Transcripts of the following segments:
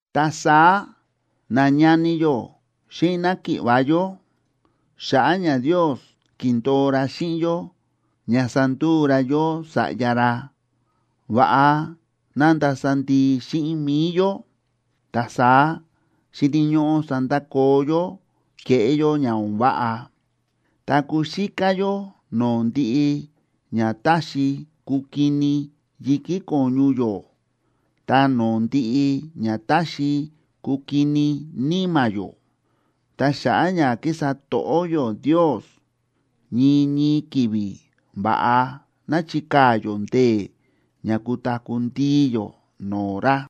Ta saá, nañani yó xíꞌin náki̱ꞌva̱ yó, xa̱ꞌa̱ ña Ndios ki̱ndo̱o ra xíꞌin yó ña sanduu ra yó sa̱ꞌya ra, va̱ꞌa ná ndasa ndii xíꞌin mi̱i yó. Ta saá xíni̱ ñóꞌó sandakoo yó kéꞌé yó ña o̱n váꞌa, ta kuxíká yó no̱o̱ ndiꞌi ña táxi kukini yi̱kí ko̱ñu yó ta no̱o̱ ndiꞌi ña táxi kukini níma̱ yó. Ta xa̱ꞌa̱ ña kísa to̱ꞌó yó Ndios, ñii ñii ki̱vi̱ va̱ꞌa ná chikaa̱ yó ndee̱ ña kutaku̱ ndii yó no̱o̱ ra.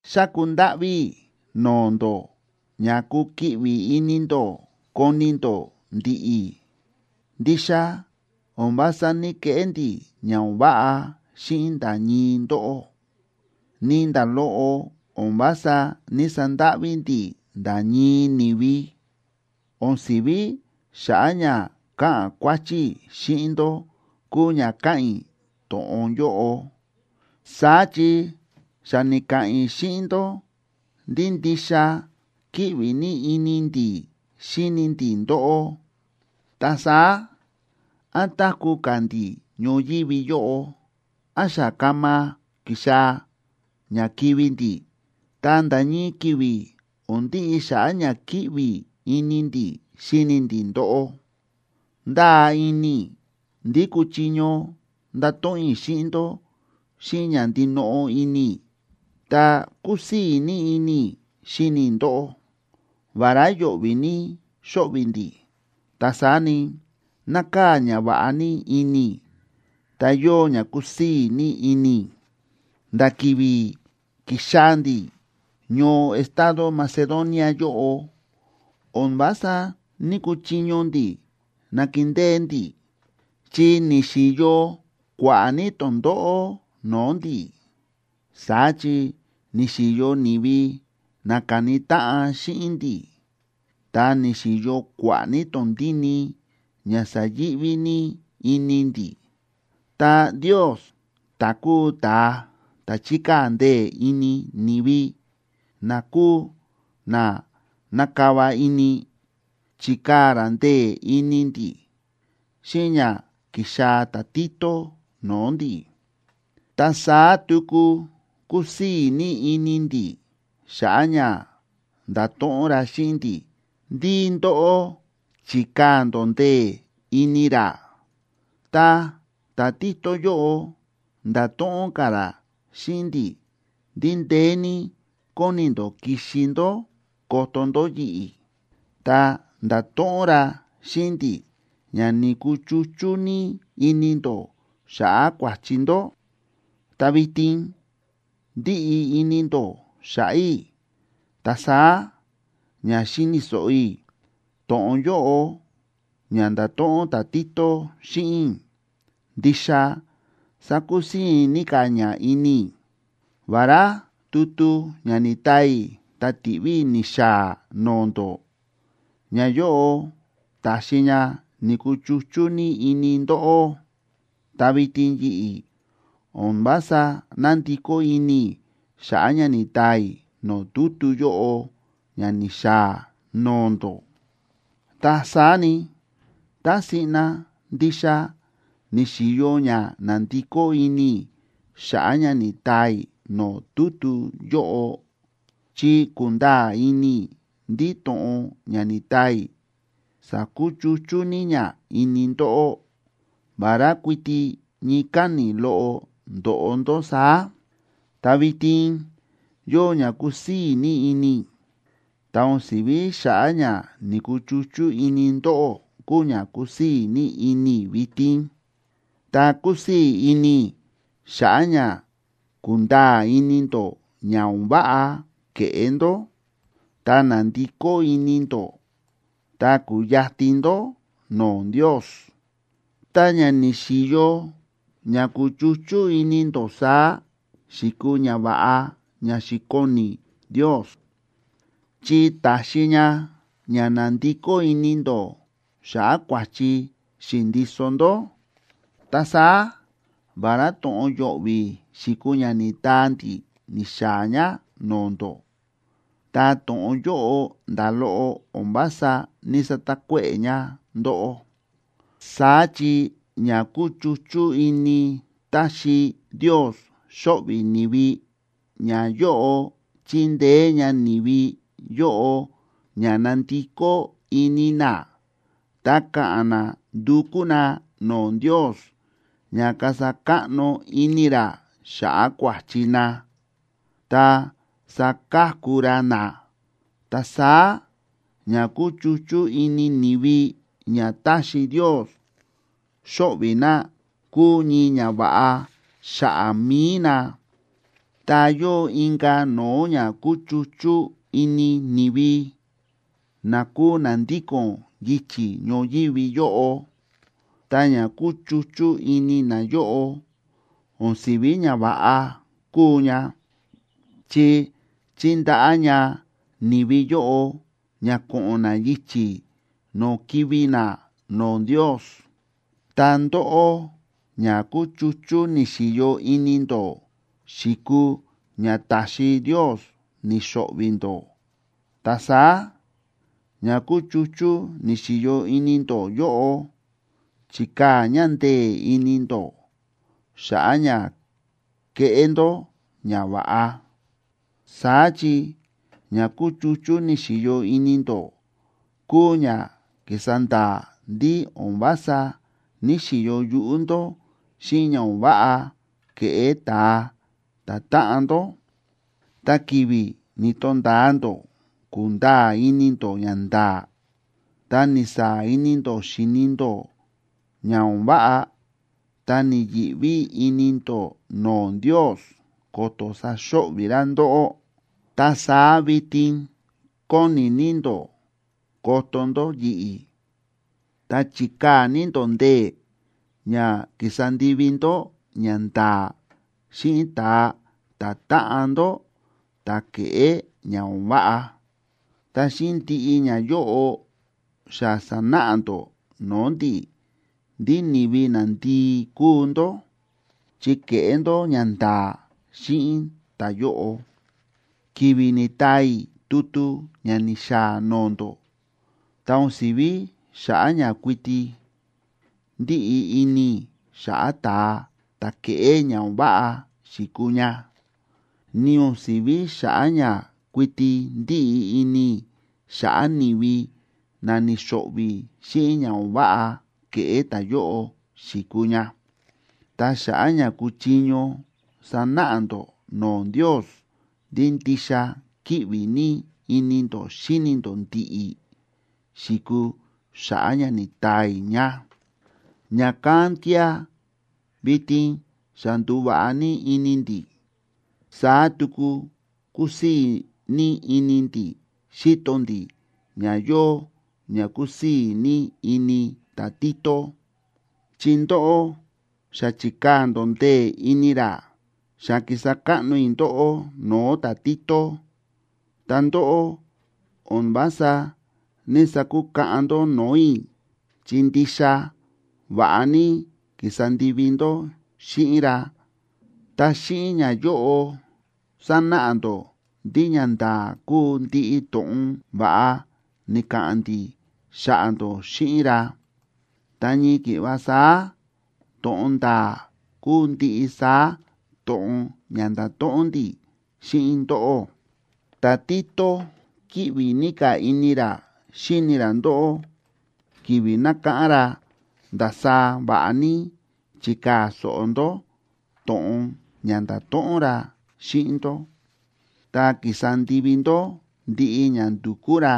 Xáku ndáꞌví i̱ no̱o̱ ndó ña kukiꞌvi ini ndó koni ndó ndi̱ꞌi̱. Ndixa o̱n vása ní‑keꞌé ndi̱ ña o̱n váꞌa xíꞌin nda̱ ñii ndóꞌó, ni nda̱ loꞌo o̱n vása ní‑sandáꞌví ndi̱ nda̱ ñii ni̱vi. O̱n si̱ví xa̱ꞌa̱ ña ka̱ꞌa̱n kua̱chi i̱ xíꞌin ndó kúu ña káꞌa̱n i̱ to̱ꞌon yóꞌo. Saá chi xa ni̱ka̱ꞌa̱n i̱ xíꞌin ndó ndí ndixa kíꞌvi ní ini ndi̱ xíni ndi̱ ndóꞌó. Ta saá, án táku̱ ka̱ ndi̱ ñoyívi yóꞌo, án xa kama kixaa̱ ña kivi̱ ndi̱, ta nda̱ ñii ki̱vi̱ o̱n ndiꞌi xa̱ꞌa̱ ña kíꞌvi ini ndi̱ xíni ndi̱ ndóꞌó. Ndáa ini i̱ ndí kúchiño ndato̱ꞌon i̱ xíꞌin ndó xíꞌin ña ndinoꞌo ini i̱, ta kúsii̱ ní ini i̱ xíni i̱ ndóꞌó. Vará yo̱ꞌvi̱ ní xóꞌvi̱ ndi̱, ta saá ni, nákaa̱ ñava̱ꞌa ní ini i̱ ta yóo ña kúsii̱ ní ini i̱. Nda̱ ki̱vi̱ ki̱xaa̱ ndi̱ ñoo estado Macedonia yóꞌo, o̱n vása ní‑kuchiño ndi̱ nakindée ndi̱, chi ni̱xi̱yo kua̱ꞌa̱ ní tondóꞌó no̱o̱ ndi̱. Saá chi ni̱xi̱yo ni̱vi na ka̱ni táꞌan xíꞌin ndi̱, ta ni̱xi̱yo kua̱ꞌa̱ ní tondíni ña sa̱yi̱ꞌví ní ini ndi̱. Ta Ndios, ta̱ kúu ta̱a ta̱ chíkaa̱ ndee̱ ini ni̱vi na kúu na na̱kava ini, chi̱kaa̱ ra ndee̱ ini ndi̱ xíꞌin ña ki̱xaa̱ ta̱Tito no̱o̱ ndi̱. Ta saá tuku kúsii̱ ní ini ndi̱ xa̱ꞌa̱ ña nda̱to̱ꞌon ra xíꞌin ndi̱ ndí ndóꞌó chi̱kaa̱ ndó ndee̱ ini ra. Ta ta̱Tito yóꞌo nda̱to̱ꞌon ka̱ ra xíꞌin ndi̱ ndí ndeé ní kóni ndó kixi ndó koto ndó yi̱ꞌi̱, ta nda̱to̱ꞌon ra xíꞌin ndi̱ ña ni̱kuchuchú ní ini ndó xa̱ꞌa̱ kua̱chi ndó, ta vitin ndíꞌi ini ndó xa̱ꞌa̱ i̱. Ta saá ña xi̱ni̱ so̱ꞌo i̱ to̱ꞌon yóꞌo ña nda̱to̱ꞌon ta̱Tito xíꞌin i̱ ndixa sa̱kusii̱ ní ka̱ ña ini i̱. Vará tutu ña ni̱taa i̱ ta ti̱ꞌví i̱ ni̱xaa̱ no̱o̱ ndó, ñayóꞌo ta̱xi ña ni̱kuchuchú ní ini ndóꞌó, ta vitin yi̱ꞌi̱ o̱n vása nándikó ini i̱ xa̱ꞌa̱ ña ni̱taa i̱ no̱o̱ tutu yóꞌo ña ni̱xaa̱ no̱o̱ ndó. Ta saá ni, tá siꞌna ndixa ni̱xi̱yo ña na̱ndikó ini i̱ xa̱ꞌa̱ ña ni̱taa i̱ no̱o̱ tutu yóꞌo, chi ku̱nda̱a̱ ini i̱ ndí to̱ꞌon ña ni̱taa i̱ sa̱kuchuchú ní ña ini ndóꞌó, vará kuiti ñii káni̱ loꞌo ndo̱ꞌo ndó saá. Ta vitin yóo ña kúsii̱ ní ini i̱. Ta o̱n si̱ví xa̱ꞌa̱ ña ni̱kuchuchú ini ndóꞌó kúu ña kúsii̱ ní ini i̱ vitin, ta kúsii̱ ini i̱ xa̱ꞌa̱ ña ku̱nda̱a̱ ini ndó ña o̱n váꞌa ke̱ꞌé ndó, ta na̱ndikó ini ndó ta ku̱yatin ndó no̱o̱ Ndios. Ta ña ni̱xi̱yo ña kúchuchú ini ndó saá xi̱kuu ñava̱ꞌa ña xi̱koni Ndios, chi ta̱xi ña ña na̱ndikó ini ndó xa̱ꞌa̱ kua̱chi xi̱ndiso ndó. Ta saá vará to̱ꞌon yo̱ꞌvi̱ xi̱kuu ña ni̱taa ndi̱ ni̱xaa̱ ña no̱o̱ ndó, ta to̱ꞌon yóꞌo nda̱ loꞌo o̱n vása ní‑satakuéꞌe̱ ña ndóꞌó. Saá chi ña kúchuchú ini táxi Ndios xóꞌvi̱ ni̱vi, ñayóꞌo chíndeé ña ni̱vi yóꞌo ña nandikó ini na, ta ka̱ꞌa̱n na ndukú na no̱o̱ Ndios ña kasa káꞌno ini ra xa̱ꞌa̱ kua̱chi na, ta saka̱ku ra na. Ta saá ña kúchuchú ini ni̱vi ña táxi Ndios xóꞌvi̱ na kúu ñii ñava̱ꞌa xa̱ꞌa̱ mi̱i na. Ta yóo inka̱ no̱o̱ ña kúchuchú ini ni̱vi na kúu na ndíko̱n yichi̱ ñoyívi yóꞌo. Ta ña kúchuchú ini nayóꞌo o̱n si̱ví ñava̱ꞌa kúu ña, chi chíndaꞌá ña ni̱vi yóꞌo ña ko̱ꞌo̱n na yichi̱ no̱o̱ kivi̱ na no̱o̱ Ndios. Ta ndóꞌó, ña kúchuchú ni̱xi̱yo ini ndó xi̱kuu ña ta̱xi Ndios ni̱xo̱ꞌvi̱ ndó. Ta saá, ña kúchuchú ni̱xi̱yo ini ndó yóꞌo chi̱kaa̱ ña ndee̱ ini ndó xa̱ꞌa̱ ña keꞌé ndó ñava̱ꞌa. Saá chi ña kúchuchú ni̱xi̱yo ini ndó kúu ña ki̱sa nda̱a̱ ndí o̱n vása ní‑xiyo yuꞌú ndó xíꞌin ña o̱n váꞌa ke̱ꞌé ta̱a ta̱táꞌan ndó. Ta ki̱vi̱ ni̱to̱nda̱a ndó ku̱nda̱a̱ ini ndó ñanda̱a̱, ta ni̱saa̱ ini ndó xi̱ni ndó ña o̱n váꞌa, ta ni̱yi̱ꞌví ini ndó no̱o̱ Ndios ko̱to̱ saxo̱ꞌvi̱ ra ndóꞌó. Ta saá vitin kóni ní ndó koto ndó yi̱ꞌi̱, ta chi̱kaa̱ ní ndó ndee̱ ña ki̱sa ndivi ndó ñanda̱a̱ xíꞌin ta̱a ta̱táꞌan ndó ta̱ ke̱ꞌé ña o̱n váꞌa. Ta xíꞌin ndiꞌi ñayóꞌo, xa sa̱náꞌa ndó no̱o̱ ndi̱ ndí ni̱vi nandii kúu ndó chi ke̱ꞌé ndó ñanda̱a̱ xíꞌin ta̱yóꞌo. Ki̱vi̱ ni̱taa i̱ tutu ña ni̱xaa̱ no̱o̱ ndó, ta o̱n si̱ví xa̱ꞌa̱ ña kuiti ndíꞌi ini i̱ xa̱ꞌa̱ ta̱a ta̱ ke̱ꞌé ña o̱n váꞌa xi̱kuu ña, ni o̱n si̱ví xa̱ꞌa̱ ña kuiti ndíꞌi ini i̱ xa̱ꞌa̱ ni̱vi na ni̱xo̱ꞌvi̱ xíꞌin ña o̱n váꞌa ke̱ꞌé ta̱yóꞌo xi̱kuu ña. Ta xa̱ꞌa̱ ña kuchiño sanáꞌa ndó no̱o̱ Ndios ndí ndixa kíꞌvi ní ini ndó xíni ndó ndi̱ꞌi̱ xi̱kuu xa̱ꞌa̱ ña ni̱taa i̱ ña. Ña̱kán kía̱ vitin xa ndu̱va̱ꞌa ní ini ndi̱. Saá tuku kúsii̱ ní ini ndi̱ xíto ndi̱ ña yóo ña kúsii̱ ní ini ta̱Tito, chi ndóꞌó xa chi̱kaa̱ ndó ndee̱ ini ra. Xa ki̱sa káꞌno i̱ ndóꞌó no̱o̱ ta̱Tito, ta ndóꞌó o̱n vása ní‑sakukaꞌan ndó no̱o̱ i̱, chi ndixa va̱ꞌa ní ki̱sa ndivi ndó xíꞌin ra. Ta xíꞌin ñayóꞌo sánáꞌa ndó ndí ñanda̱a̱ kúu ndiꞌi to̱ꞌon va̱ꞌa ni̱ka̱ꞌa̱n ndi̱ xa̱ꞌa̱ ndó xíꞌin ra. Ta ñii ki̱ꞌva saá to̱ꞌon nda̱a̱ kúu ndiꞌi saá to̱ꞌon ña nda̱to̱ꞌon ndi̱ xíꞌin ndóꞌó. Ta̱Tito kíꞌvi ní ka̱ ini ra xíni ra ndóꞌó ki̱vi̱ nákáꞌán ra ndasaá va̱ꞌa ní chi̱kaa̱ so̱ꞌo ndó to̱ꞌon ña nda̱to̱ꞌon ra xíꞌin ndó, ta ki̱sa ndivi ndó ndiꞌi ña ndu̱kú ra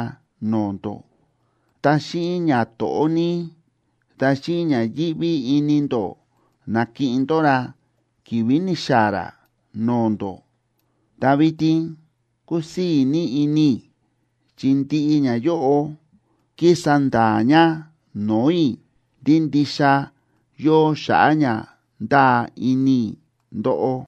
no̱o̱ ndó. Ta xíꞌin ñato̱ꞌó ní ta xíꞌin ña yíꞌví ini ndó, na̱kiꞌin ndó ra ki̱vi̱ ni̱xaa̱ ra no̱o̱ ndó. Ta vitin kúsii̱ ní ini i̱ chi ndiꞌi ñayóꞌo kísa nda̱a̱ ña no̱o̱ i̱ ndí ndixa yóo xa̱ꞌa̱ ña ndáa ini i̱ ndóꞌó.